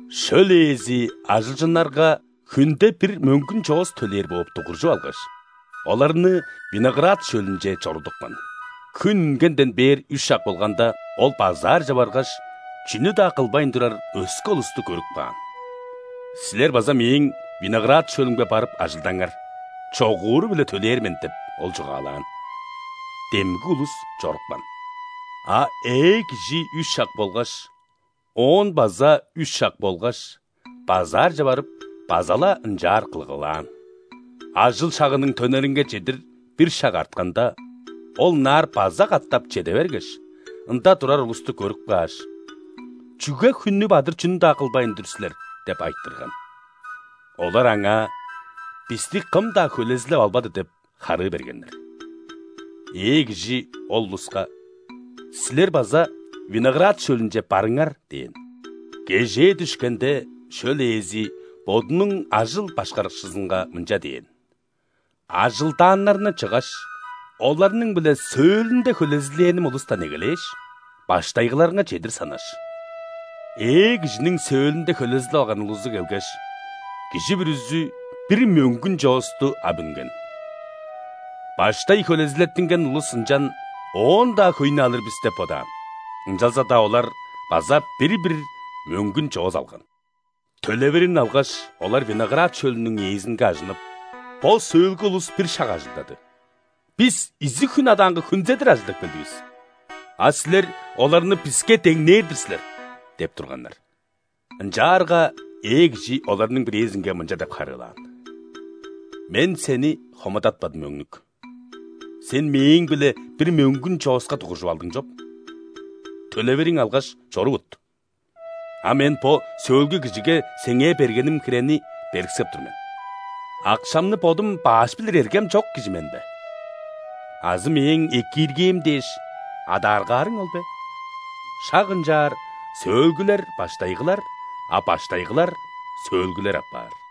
Шөл ээзи ажылчыннарга хүнде бир мөңгүн чоос төлээр бооп дугуржуп алгаш, оларны виноград шөлүнче чорудупкан. Хүн үнгенден бээр үш шак болганда, ол базаарже баргаш, чүнү-даа кылбайн турар өске улусту көрүп каан. „Силер база мээң виноград шөлүмге барып ажылдаңар. Чогууру-биле төлээр мен“ – деп, ол чугаалаан. Демги улус чорупкан. А ээ кижи үш шак болгаш, оон база үш шак болгаш, базаарже барып, база-ла ынчаар кылгылаан. Ажыл шагының төнеринге чедир бир шак артканда, ол ынаар база катап чеде бергеш, ында турар улусту көрүп кааш: „Чүге хүннү бадыр чүнү-даа кылбайн тур силер?“ – деп айтырган. Олар аңаа: „Бисти кым-даа хөлезилеп албады“ – деп харыы бергеннер. Ээ кижи ол улуска: „Силер база виноград шөлүнче барыңар“ – дээн. Кежээ дүшкенде, шөл ээзи бодунуң ажыл башкарыкчызынга мынча дээн: „Ажылдааннарны чыггаш, оларның-биле сөөлүнде хөлезилээним улустан эгелээш, баштайгыларынга чедир санаш“. Ээ кижиниң сөөлүнде хөлезилеп алган улузу келгеш, кижи бүрүзү бир мөңгүн чоосту ап үнген. Баштай хөлезилеттинген улус ынчан оон-даа хөйнү алыр бис деп бодаан, ынчалза-даа олар база бир-бир мөңгүн чоос алган. Төлевирин алгаш, олар виноград шөлүнүң ээзинге ажынып: „Бо сөөлгү улус бир шак ажылдады, бис изиг хүн адаанга хүнзедир ажылдап келдивис, а силер оларны биске деңнээр-дир силер“ – деп турганнар. Ынчаарга ээ кижи оларның бирээзинге мынча деп харыылаан: „Мен сени хомудатпадым, өңнүк. Сен мээң-биле бир мөңгүн чооска дугуржуп алдың чоп. Төлевириң алгаш, чорувут. А мен бо сөөлгү кижиге сеңээ бергеним хирени бериксеп тур мен. Акшамны бодум баш билир эргем чок кижи мен бе? Азы мээң экииргээм дээш, адааргаарың ол бе?“ Шак ынчаар сөөлгүлер – баштайгылар, а баштайгылар – сөөлгүлер апаар».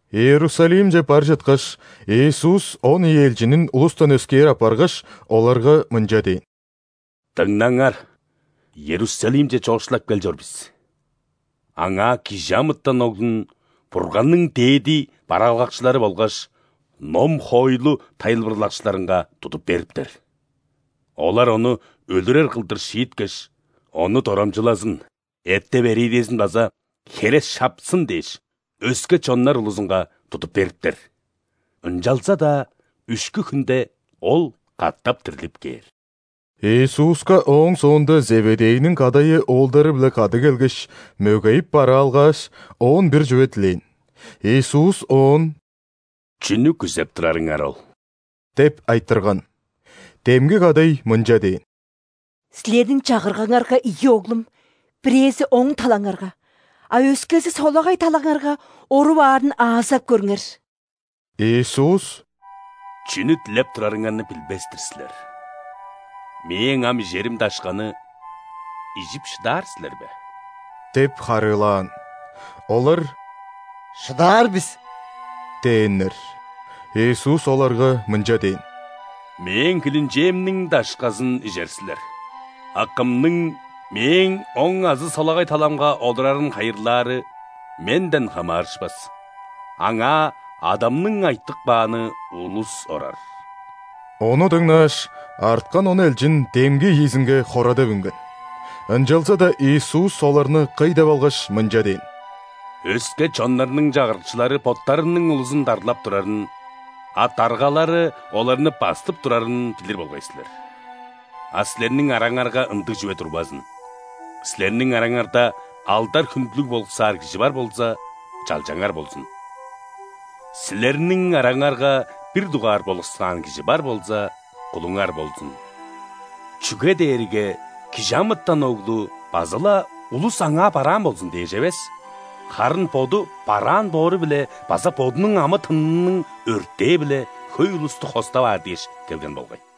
Иерусалимче бар чыткаш, Иисус он ийи элчинин улустан өскээр аппаргаш, оларга мынча дээн: «Дыңнаңар, Иерусалимче чоокшулап кел чор бис. Аңаа ·Кижи амытан Оглун Бурганның дээди бараалгакчылары болгаш ном-хоойлу тайылбырлакчыларынга тудуп бериптер. Олар Ону өлүрер кылдыр шииткеш, Ону дорамчылазын, эттеп-эриидезин база хере шапсын дээш, өске чоннар улузунга тудуп бериптер. Ынчалза-даа үшкү хүнде Ол катап дирлип кээр». Иисуска ооң соонда Зеведейниң кадайы оолдары-биле кады келгеш, мөгейип бараалгааш, Оон бир чүве дилээн. Иисус оон: «Чүнү күзеп турарыңар ол?» – деп айтырган. Демги кадай мынча дээн: «Силерниң Чагыргаңарга ийи оглум: бирээзи – оң талаңарга, а өскези – солагай талаңарга оруп аарын аазап көрүңер». Иисус: «Чүнү дилеп турарыңарны билбес-тир силер. Мээң ам ижерим дашканы ижип шыдаар силер бе?» – деп харыылаан. Олар: «Шыдаар бис» – дээннер. Иисус оларга мынча дээн: «Мээң хилинчээмниң дашказын ижер силер, а кымның Мээң оң азы солагай таламга олурарын хайырлаары Менден хамаарышпас: аңаа Адамның айтып кааны улус орар». Ону дыңнааш, арткан он элчин демги ийизинге хорадап үнген. Ынчалза-даа Иисус оларны кый деп алгаш, мынча дээн: «Өске чоннарның чагырыкчылары боттарының улузун дарлап турарын, а даргалары оларны бастып турарын билир болгай силер. А силерниң араңарга ындыг чүве турбазын! Силерниң араңарда алдар-хүндүлүг болуксаар кижи бар болза, чалчаңар болзун. Силерниң араңарга бир дугаар болуксаан кижи бар болза, кулуңар болзун. Чүге дээрге ·Кижи амытан Оглу база-ла улус Аңаа бараан болзун дээш эвес, харын Боду бараан боору-биле база Бодунуң амы-тынының өртээ-биле хөй улусту хостап аар дээш келген болгай».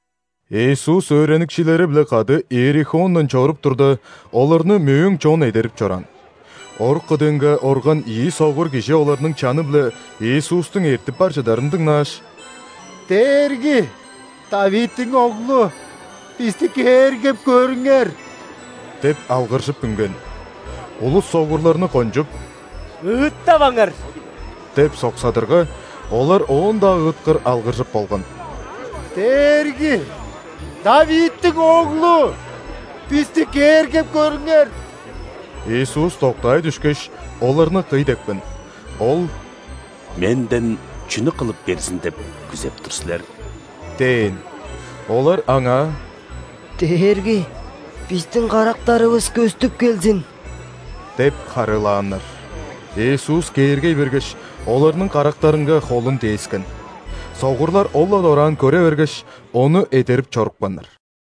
Иисус өөреникчилери-биле кады Иерихондан чоруп турда, оларны мөөң чон эдерип чораан. Орук кыдыынга орган ийи согур кижи оларның чаны-биле Иисустуң эртип бар чыдарын дыңнааш: «Дээрги! ·Давидтиң Оглу, бисти кээргеп көрүңер!» – деп алгыржып үнген. Улус согурларны кончуп: «Ыыттаваңар!» – деп соксадырга, олар оон-даа ыыткыр алгыржыр болган: «Дээрги! ·Давидтиң Оглу, бисти кээргеп көрүңер!» Иисус доктаай дүшкеш, оларны кый депкен. Ол: «Менден чүнү кылып берзин деп күзеп тур силер?» – дээн. Олар Аңаа: «Дээрги, бистиң карактарывыс көстүп келзин» – деп харыылааннар. Иисус кээргей бергеш, оларның карактарынга холун дээскен. Согурлар ол-ла дораан көре бергеш, Ону эдерип чорупканнар.